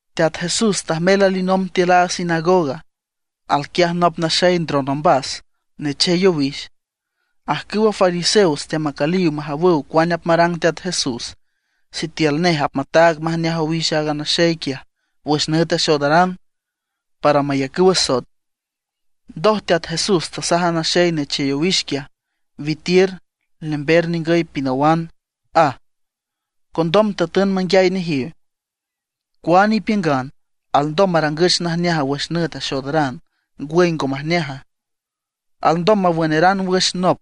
Teat Jesús tajmel alinomb tiül a sinagoga. Al quiaj nop naxey ndron ombas, nechey owix. Ajcüwa fariseos teamacüliw majawüw cuane apmarang Teat Jesús, sitiül nej apmataag majneaj owix a naxey quiaj wüx nüt axoodaran, para mayacüw asoet. Ndoj Teat Jesús tasaj a naxey nechey owix quiaj: ―Witiür, lember ningüy pinawan ―aj. Condom tatün manguiay nejiw: ―¿Cuane ipiüngan, alndom marangüch najneaj wüx nüt axoodaran, ngwüy ngo majneaja? ¿Alndom mawünaran wüx nop,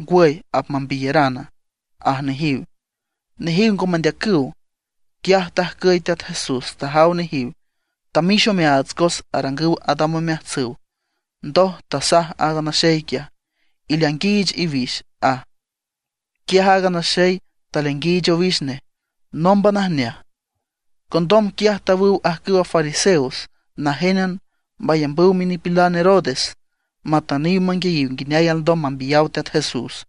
ngwüy apmambiyarana? ―aj nejiw. Nejiw ngo mendeacüw. Quiaj tajcüy Teat Jesús, tajaw nejiw, tamix omeaats cos arangüw adam omeajtsüw. Ndoj tasaj a naxey quiaj: ―Ileainguiich iwix ―aj. Quiaj aaga naxey taleainguiich owix nej, nómban ajneaj. Condom quiaj tawüw ajcüwa fariseos najénan mayambüw minipilan Herodes, matüniw manguiayiw nguineay alndom mambiyaw Teat Jesús.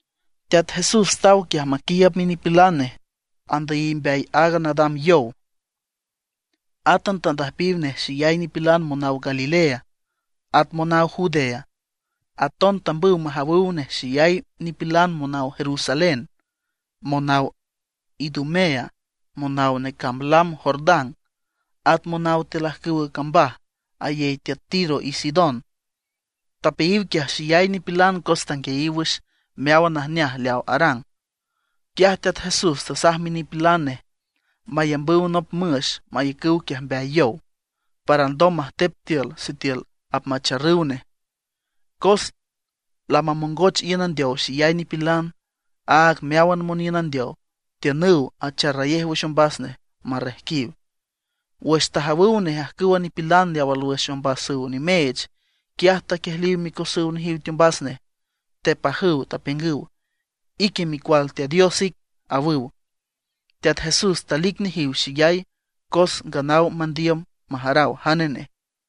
Teat Jesús taw quiaj maquiiüb minipilan nej, andüyiw mbeay aaga nadam yow. Átan tandüjpiw nej xeyay nipilan monaw Galilea, at monaw Judea. Aton tambüw majawüw nej xeyay nipilan monaw Jerusalén, monaw Idumea, monaw necamb lam Jordán, at monaw tiül ajcüwa cambaj ayey tiüt Tiro y Sidón. Tapeayiw quiaj xeyay nipilan cos tanguiayiw wüx meáwan najneaj leaw arang. Quiaj Teat Jesús tasaj minipilan nej mayambüw nop müx mayacüw quiaj mbeay yow, para alndom majtep tiül sitiül apmacharrüw nej. Cos lamamongoch iün andeow xeyay nipilan, áag meáwan moniün andeow tiünüw acharrayej wüx ombas nej, marrejquiw. Wüx tajawüw nej ajcüwa nipilan leaw alwüx ombasüw nimeech, quiaj taquiejliw micosüw nejiw teombas nej, tepajüw, tapiüngüw: ―¡Ique Micual Teat Dios ic! ―awüw. Teat Jesús talic nejiw xeyay cos nganaw mandiüm majaraw jane nej.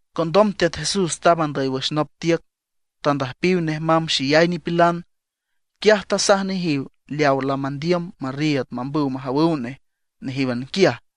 Condom Teat Jesús tamb andüy wüx nop tiüc, tandüjpiw nej mamb xeyay nipilan. Quiaj tasaj nejiw leaw lamandiüm marriiüd mambüw majawüw nej nejíwan quiaj.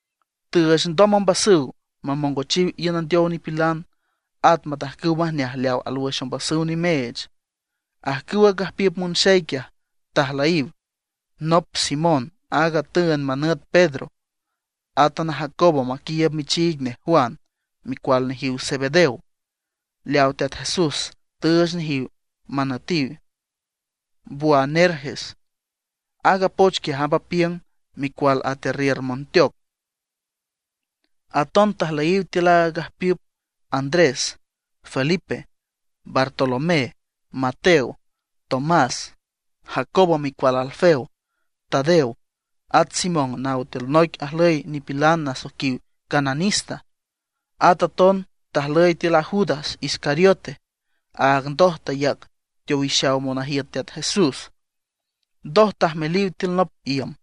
Tüüch ndoj ombasüw mamongochiw iün andeow nipilan, at matajcüw majneaj leaw alwüx ombasüw nimeech. Ajcüwa gajpiüp monxey quiaj tajlüyiw: nop Simón aaga tüünd manüt Pedro. Átan a Jacobo maqiiüb michiig nej Juan, micual nejiw Zebedeo, leaw Teat Jesús tüüch nejiw manütiw Boanerges; aaga poch quiaj amb apiüng: micual atearriür monteoc. Aton tajlüyiw tiül aaga gajpiüp: Andrés, Felipe, Bartolomé, Mateo, Tomás, Jacobo micual Alfeo, Tadeo, at Simón naw tiül noic ajlüy nipilan nasoiquiw Cananista. At aton talüy tiül a Judas Iscariote, aaga ndoj tayac teowixaw monajiüt Teat Jesús. Ndoj tajmeliw tiül nop iüm.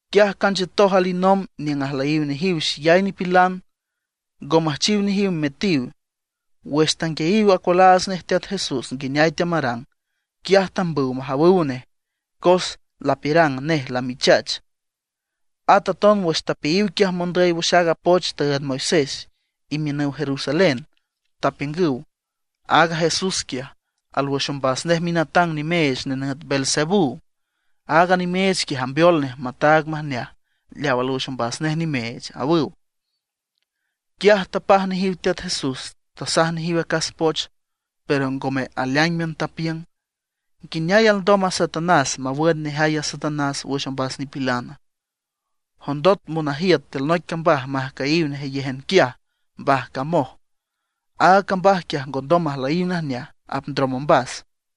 Quiaj canchiütoj alinomb niüng ajlüyiw nejiw xeyay nipilan, ngo müjchiw nejiw metiw. Wüx tanguiayiw acualaats nej Teat Jesús nguineay teamarang, quiaj tambüw majanüw nej, cos lapiürang nej lamichach. At aton wüx tapeayiw quiaj mondüy wüx aaga poch tüünd Moisés, imiünüw Jerusalén, tapiüngüw: ―Aaga Jesús quiaj, alwüx ombas nej minatang nimeech nenüt Beelzebú; aaga nimeech quiaj ambeol nej mataag majneaj leaw alwüx ombas nej nimeech ―awüw. Quiaj tapaj nejiw Teat Jesús, tasaj nejiw acas poch, pero ngome aleáingan. Tapiüng: ―¿Nguineay alndom a Satanás mawün nejay a Satanás wüx ombas nipilana? Jondot monajiüt tiül noic cambaj majcüyiw nejeyéjan quiaj mbajcamoj, aaga cambaj quiaj ngondom majlüy najneaj, apndrom ombas.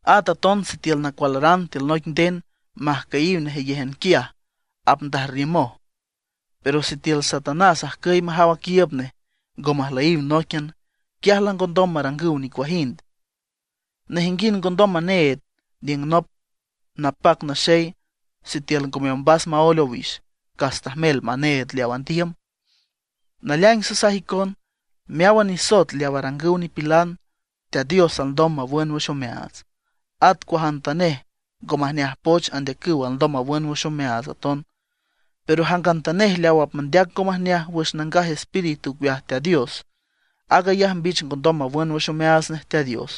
At aton sitiül nacualaran tiül noic nden majcüyiw nejeyéjan quiaj, apndajrriümoj. Pero sitiül Satanás ajcüy majaw aquiiüb nej, ngo majlüyiw nóiquian, quiaj langondom marangüw nicuajind. ’Nejinguind ngondom maneed aniüng nop napac naxey sitiül ngome ombas maóel owix, cas tajmel maneed leaw andiüm. ’Naleaing sasaj icon, meáwan nisoet leaw arangüw nipilan, Teat Dios alndom mawün wüx omeaats. At cuajantanej ngo majneaj poch andeacüw alndom mawün wüx omeaats aton. Pero jangantanej leaw apmandeac ngo majneaj wüx Nangaj Espíritu ocueaj Teat Dios, aag ayaj mbich ngondom mawün wüx omeaats nej Teat Dios.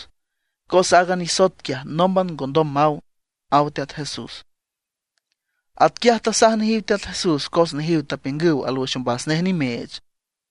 Cos aaga nisoet quiaj nómban ngondom maw ―aw Teat Jesús. Atquiaj tasaj nejiw Teat Jesús cos nejiw tapiüngüw alwüx ombas nej nimeech.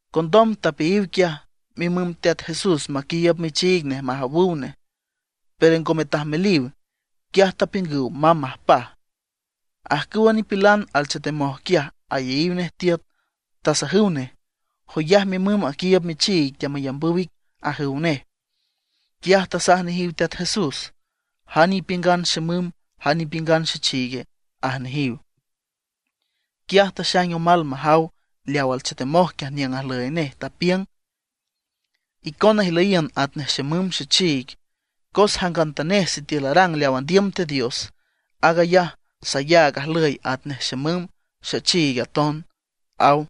Condom tapeayiw quiaj mimüm Teat Jesús maquiiüb michiig nej majawüw nej, pero ngome tajmeliw. Quiaj tapiüngüw mamb majpaj. Ajcüwa nipilan alchetemoj quiaj ayeyiw nej tiüt, tasajüw nej: ―Joyaj mimüm aquiiüb michiig teamayambüw ic ―ajüw nej. Quiaj tasaj nejiw Teat Jesús: ―¿Jane ipiüngan xemüm, jane ipiüngan xechiig? ―aj nejiw. Quiaj taxaing omal majaw leaw alchetemoj quiaj niüng ajlüy nej, tapiüng: ―Icona ijlüyiün atnej xemüm, xechiig. Cos jangantanej sitiül arang leaw andiüm Teat Dios, aag ayaj sayaag ajlüy atnej xemüm, xechiig aton ―aw.